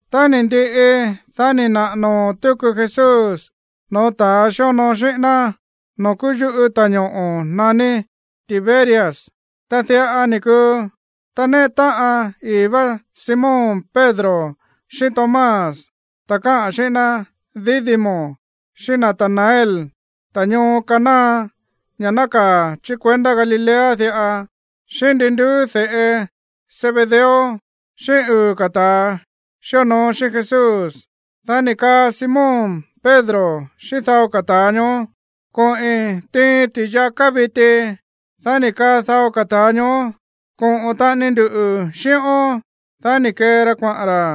Tá ni̱ ndiꞌi, dá ni̱ naꞌa̱ noo̱ tuku Jesús no̱ó ta̱ xíonoo xíꞌín ná noo̱ kúú yuꞌú ta̱ñoꞌo̱ naní Tiberias. Ta diꞌa ni̱ kuu: Ta néꞌe táꞌan ii̱ vá Simón Pedro xíꞌín Tomás, ta̱ káꞌa̱n xíꞌín ná Dídimo, xíꞌín Natanael, ta̱ ñoo Caná, ña̱ nákaa̱ chí kuendá Galilea diꞌa, xíꞌín ndi nduú de̱ꞌe Zebedeo, xíꞌín uu̱ ka̱ ta̱ xíonoo xíꞌín Jesús. Dá ni̱ kaa Simón Pedro xíꞌín dao ka̱ ta̱a ñoó: ―Koꞌi̱n tiin ti̱yaká viti. Dá ni̱ kaa dao ka̱ ta̱a ñoó: ―Koꞌo̱n taꞌani nduꞌu̱ xíꞌón. Dá ni̱ kee ra kuaꞌa̱n ra̱.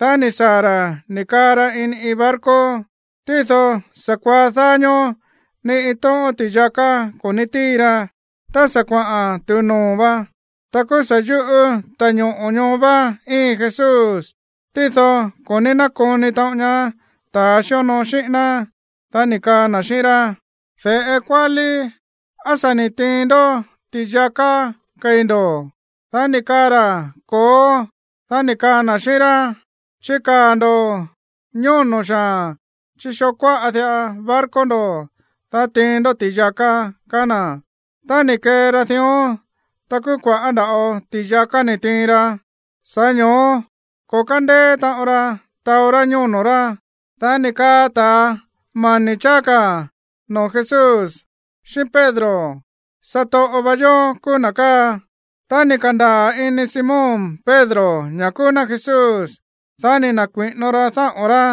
Dá ni̱ saa̱ ra̱ ni̱ kaa ra ini iin barco, tído sa̱kuaá dáá ñóó ni iin tóꞌón ti̱yaká ko̱ ní tíin ra. Tá sa̱ kuaꞌa̱n tu̱u noo̱ vá, ta kúú sa̱ yuꞌú ta̱ñoꞌo̱ ñoó vá íin Jesús, tído ko̱ ní nákoni taꞌon ñaá ta̱ xíonoo xíꞌín ná. Dá ni̱ kaa na̱ xíꞌín rá: ―De̱ꞌe kuálí, ¿á sa̱ ni̱ tiin ndó ti̱yaká kei̱ ndo̱? Dá ni̱ kaa ra̱: ―¡Ko̱ó! Dá ni̱ kaa na̱ xíꞌín rá: ―Chikaa̱ ndo̱ ñóno̱ xaa̱n chí xoo kuáꞌa diꞌa barco ndo̱, dá tiin ndó ti̱yaká ―kaá na̱. Tá ni̱ kee ra dión, ta kúú kua̱ꞌá nda̱ꞌo ti̱yaká ni̱ tiin ra, sa̱ꞌá ño̱ó ko̱ kándeé taꞌon ra taó rá ñóno̱ rá. Dá ni̱ kaa ta̱ mani̱ cháá ka̱ noo̱ Jesús xíꞌín Pedro: ―¡Satoꞌo va yó kúú na̱ káa! Tá ni̱ ka̱ndaa̱ ini Simón Pedro ña̱ kúú ná Jesús, dá ni̱ na̱kui̱ꞌino ra dáꞌo̱n rá,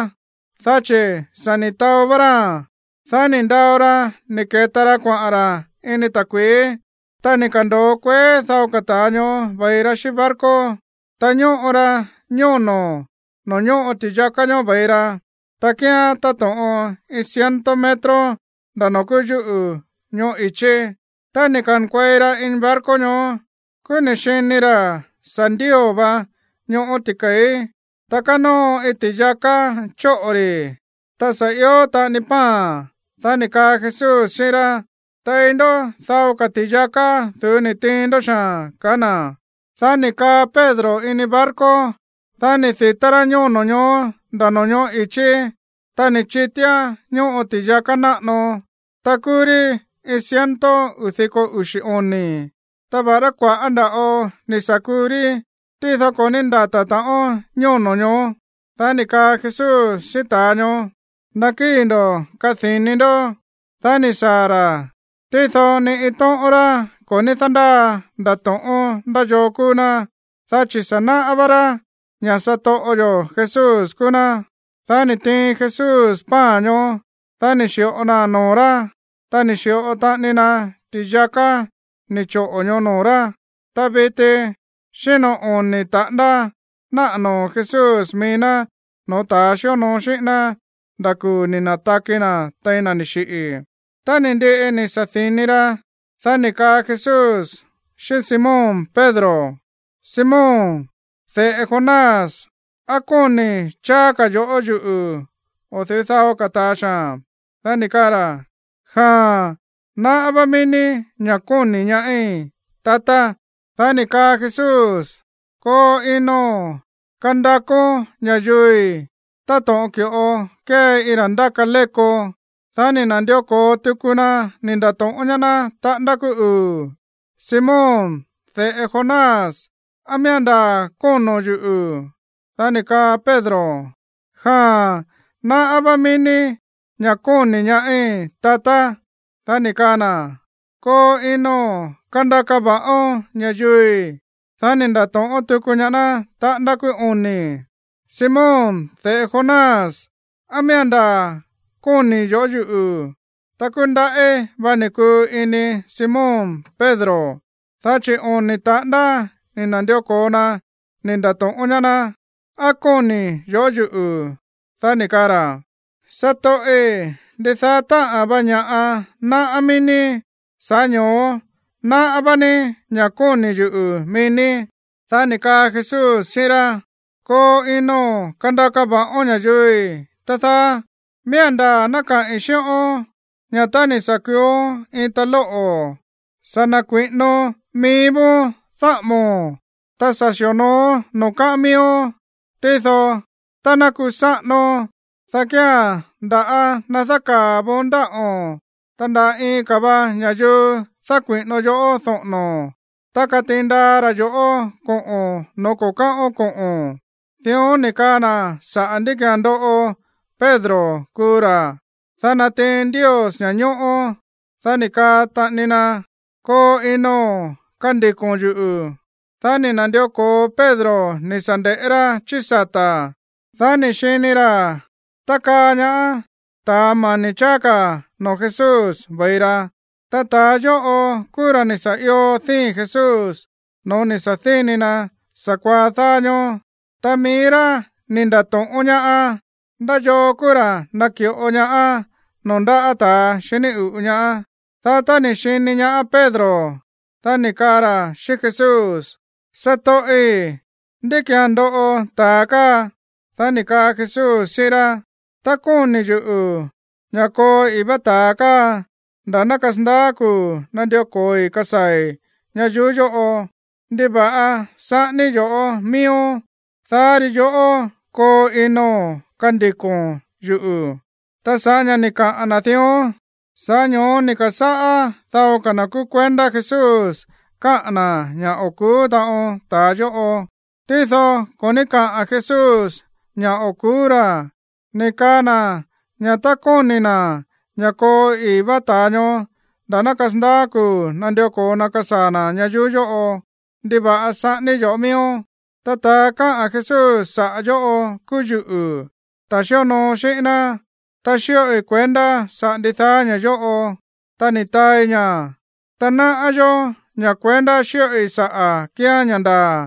dá chi̱ sa̱ ni̱ taó vá ráa̱n. Dá ni̱ ndao ra ni̱ ke̱ta ra kuaꞌa̱n ra̱ ini ta̱kui̱í. Ta ni̱ ka̱ndo̱o kueé dao ka̱ ta̱a ñoó ve̱i ra xíꞌín barco. Ta ñóꞌo ra ñóno̱ noo̱ ñóꞌo ti̱yaká ñoó ve̱i ra, ta kíán táto̱ꞌon iin ciento metro nda̱ noo̱ kúú yúꞌu̱ ñoꞌó i̱chí. Tá ni̱ ka̱nkuei ra ini barco ñoó, kúú ni̱ xini ra̱ sa̱ ndío̱ va ñóꞌo̱ ti̱ke̱í, ta kánóo iin ti̱yaká chóꞌo̱ rí, ta sa̱ ió taꞌani pan. Dá ni̱ kaa Jesús xíꞌín rá: ―Tei ndó dao ka̱ ti̱yaká du̱ú ni̱ tiin ndó xaa̱n ―kaá na̱. Dá ni̱ kaa Pedro ini barco, dá ni̱ di̱tá rá ñóno̱ ñoó nda̱ no̱ñóꞌo̱ i̱chí, ta ni̱ chitíán ñóꞌo ti̱yaká náꞌano, ta kúú rí iin ciento uu̱ diko uxi̱ oni̱. Ta va̱ꞌará kua̱ꞌá nda̱ꞌo ni̱ sa̱ kuu rí, tído ko̱ ní ndata̱ taꞌon ñóno̱ ñoó. Dá ni̱ kaa Jesús xíꞌín ta̱a ñoó: ―Nakíi̱ ndo̱ kadi̱ni ndo̱. Dá ni̱ saa̱ ra̱, tído ni iin tóꞌón rá ko̱ ní dándáa ndato̱ꞌón ndá yoo kúú ná, dá chi̱ sa̱ náꞌá vá rá ña̱ satoꞌo yo̱ Jesús kúú ná. Dá ni̱ tiin Jesús pan ñoó, dá ni̱ xi̱ꞌo naa̱n noo̱ rá, ta ni̱ xi̱ꞌo taꞌani na ti̱yaká ni̱ choꞌo̱ ñoó noo̱ rá. Ta viti xíno oni̱ taꞌándá náꞌa̱ noo̱ Jesús mií ná no̱ó ta̱ xíonoo xíꞌín ná nda̱ kuu̱ ni̱ na̱taki na̱ tein na̱ ni̱ xiꞌi̱. Tá ni̱ ndiꞌi ni̱ sa̱di̱ni ra̱, dá ni̱ kaa Jesús xíꞌín Simón Pedro: ―Simón, de̱ꞌe Jonás, ¿á kóni̱ cháá ka̱ yo̱ꞌó yuꞌu̱ o̱ du̱ú dao ka̱ ta̱a xaa̱n? Dá ni̱ kaa ra̱: ―Jaa̱n, náꞌá vá mií ní ña̱ kóni̱ ñaáí, tatá. Dá ni̱ kaa Jesús: ―Koo ino̱n kandakón ña̱yuui̱ táto̱ꞌon ki̱ꞌo kée iin ra̱ ndáka léko. Dá ni̱ na̱ndió ko̱o tuku na ni̱ nda̱to̱ꞌón ñaá ná taꞌándá kúú uu̱: ―Simón, de̱ꞌe Jonás, ¿á miía̱n ndaa̱ kóno̱n yuꞌu̱? Dá ni̱ kaa Pedro: ―Jaa̱n, náꞌá vá mií ní ña̱ kóni̱ ñaáí, tatá. Dá ni̱ kaa na̱: ―Koo ino̱n kandaka va̱ꞌón ña̱yuui̱. Dá ni̱ nda̱to̱ꞌón tuku ñaá ná taꞌándá kúú oni̱: ―Simón, de̱ꞌe Jonás, ¿á miía̱n ndaa̱ kóni̱ yo̱ꞌó yuꞌu̱? Ta kúú ndaꞌí va ni̱ kuu ini Simón Pedro, dá chi̱ oni̱ taꞌándá ni̱ na̱ndió ko̱o na ni̱ nda̱to̱ꞌón ñaá ná: “¿Á kóni̱ yo̱ꞌó yuꞌu̱?” Dá ni̱ kaa ra̱: ―Satoꞌi̱, ndidaá táꞌa̱n va ña̱ꞌa náꞌá mií ní, sa̱ꞌá ño̱ó náꞌá vá ní ña̱ kóni̱ yuꞌu̱ mií ní. Dá ni̱ kaa Jesús xíꞌín rá: ―Koo ino̱n kandaka va̱ꞌón ña̱yuui̱, tá dáá. Miía̱n ndaa̱ ná kaꞌi̱n xíꞌón ña̱ tá ni̱ sa̱ kuuón iin ta̱ lóꞌo̱, sa̱ na̱kui̱ꞌínón mií vóón dáꞌa̱mo̱n, ta sa̱ xi̱onooón noo̱ káꞌán miíón. Tído tá ná kusáꞌánón, dá kía̱n ndá ná dákaa̱ voon ndáꞌo̱n, ta nda̱ iin ka̱ va ña̱yuu dákui̱ꞌino yoꞌó doꞌo̱no̱, ta katiin ndaa ra̱ yo̱ꞌó koꞌo̱n no̱ó ko̱ káꞌón koꞌo̱n. Dión ni̱ kaꞌa̱n na̱ sa̱ꞌá ndí ki̱án ndoꞌo Pedro kuu ra̱, dá natiin Ndios ña̱ñóꞌó. Dá ni̱ kaa taꞌani na: ―Koo ino̱n kandiko̱n yuꞌu̱. Dá ni̱ na̱ndió ko̱o Pedro ni̱ sa̱ nde̱ꞌé rá chí sata̱, dá ni̱ xini ra̱ tákaa ñaá ta̱ mani̱ cháá ka̱ noo̱ Jesús ve̱i ra. Ta ta̱a yóꞌo kúú ra̱ ni̱ sa̱ io díi̱n Jesús no̱ó ni̱ sa̱díni na̱ sa̱kuaá dáá ñóó, ta mií rá ni̱ nda̱to̱ꞌón ñaá: “¿Ndá yoo kúú ra̱ naki̱ꞌo ñaá noo̱ ndáꞌa̱ ta̱a xiní uꞌu̱ ñaá?” Dá tá ni̱ xini ñaá Pedro, dá ni̱ kaa ra̱ xíꞌín Jesús: ―Satoꞌi̱, ¿ndí ki̱án ndoꞌo ta̱a káa? Dá ni̱ kaa Jesús xíꞌín rá: ―Tá kóni̱ yuꞌu̱ ña̱ koo ii̱ vá ta̱a káa nda̱ ná kasandaá kuu̱ nandió ko̱oi kasaa̱i̱ ñayuú yóꞌo, ¿ndiva̱ꞌa saꞌání yoꞌó miíón? Dá ri yoꞌó koo ino̱n kandiko̱n yuꞌu̱. Ta sa̱ꞌá ña̱ ni̱ kaꞌa̱n na̱ dión, sa̱ꞌá ño̱ó ni̱ ka̱sáꞌá dao ka̱ na̱ kúú kuendá Jesús káꞌa̱n na̱ ña̱ o̱ ku̱ú taꞌon ta̱a yóꞌo. Tído ko̱ ní káꞌa̱n Jesús ña̱ o̱ ku̱ú ra̱, ni̱ kaa na̱ ña̱ tá kóni̱ na̱ ña̱ koo ii̱ vá ta̱a ñoó nda̱ ná kasandaá kuu̱ nandió ko̱o na kasaa̱ na̱ ñayuú yóꞌo: “¿Ndiva̱ꞌa saꞌání yoꞌó miíón?” Ta ta̱a káꞌa̱n Jesús saꞌa̱ yóꞌo kúú yuꞌu̱, ta̱ xíonoo xíꞌín ná, ta xíꞌoi kuendá saꞌa̱ ndidaá ña̱ yóꞌo, ta ni̱ taai ña̱. Ta náꞌá yó ña̱ kuendá xíꞌoi sa̱ꞌán kíán ña̱ ndaa̱.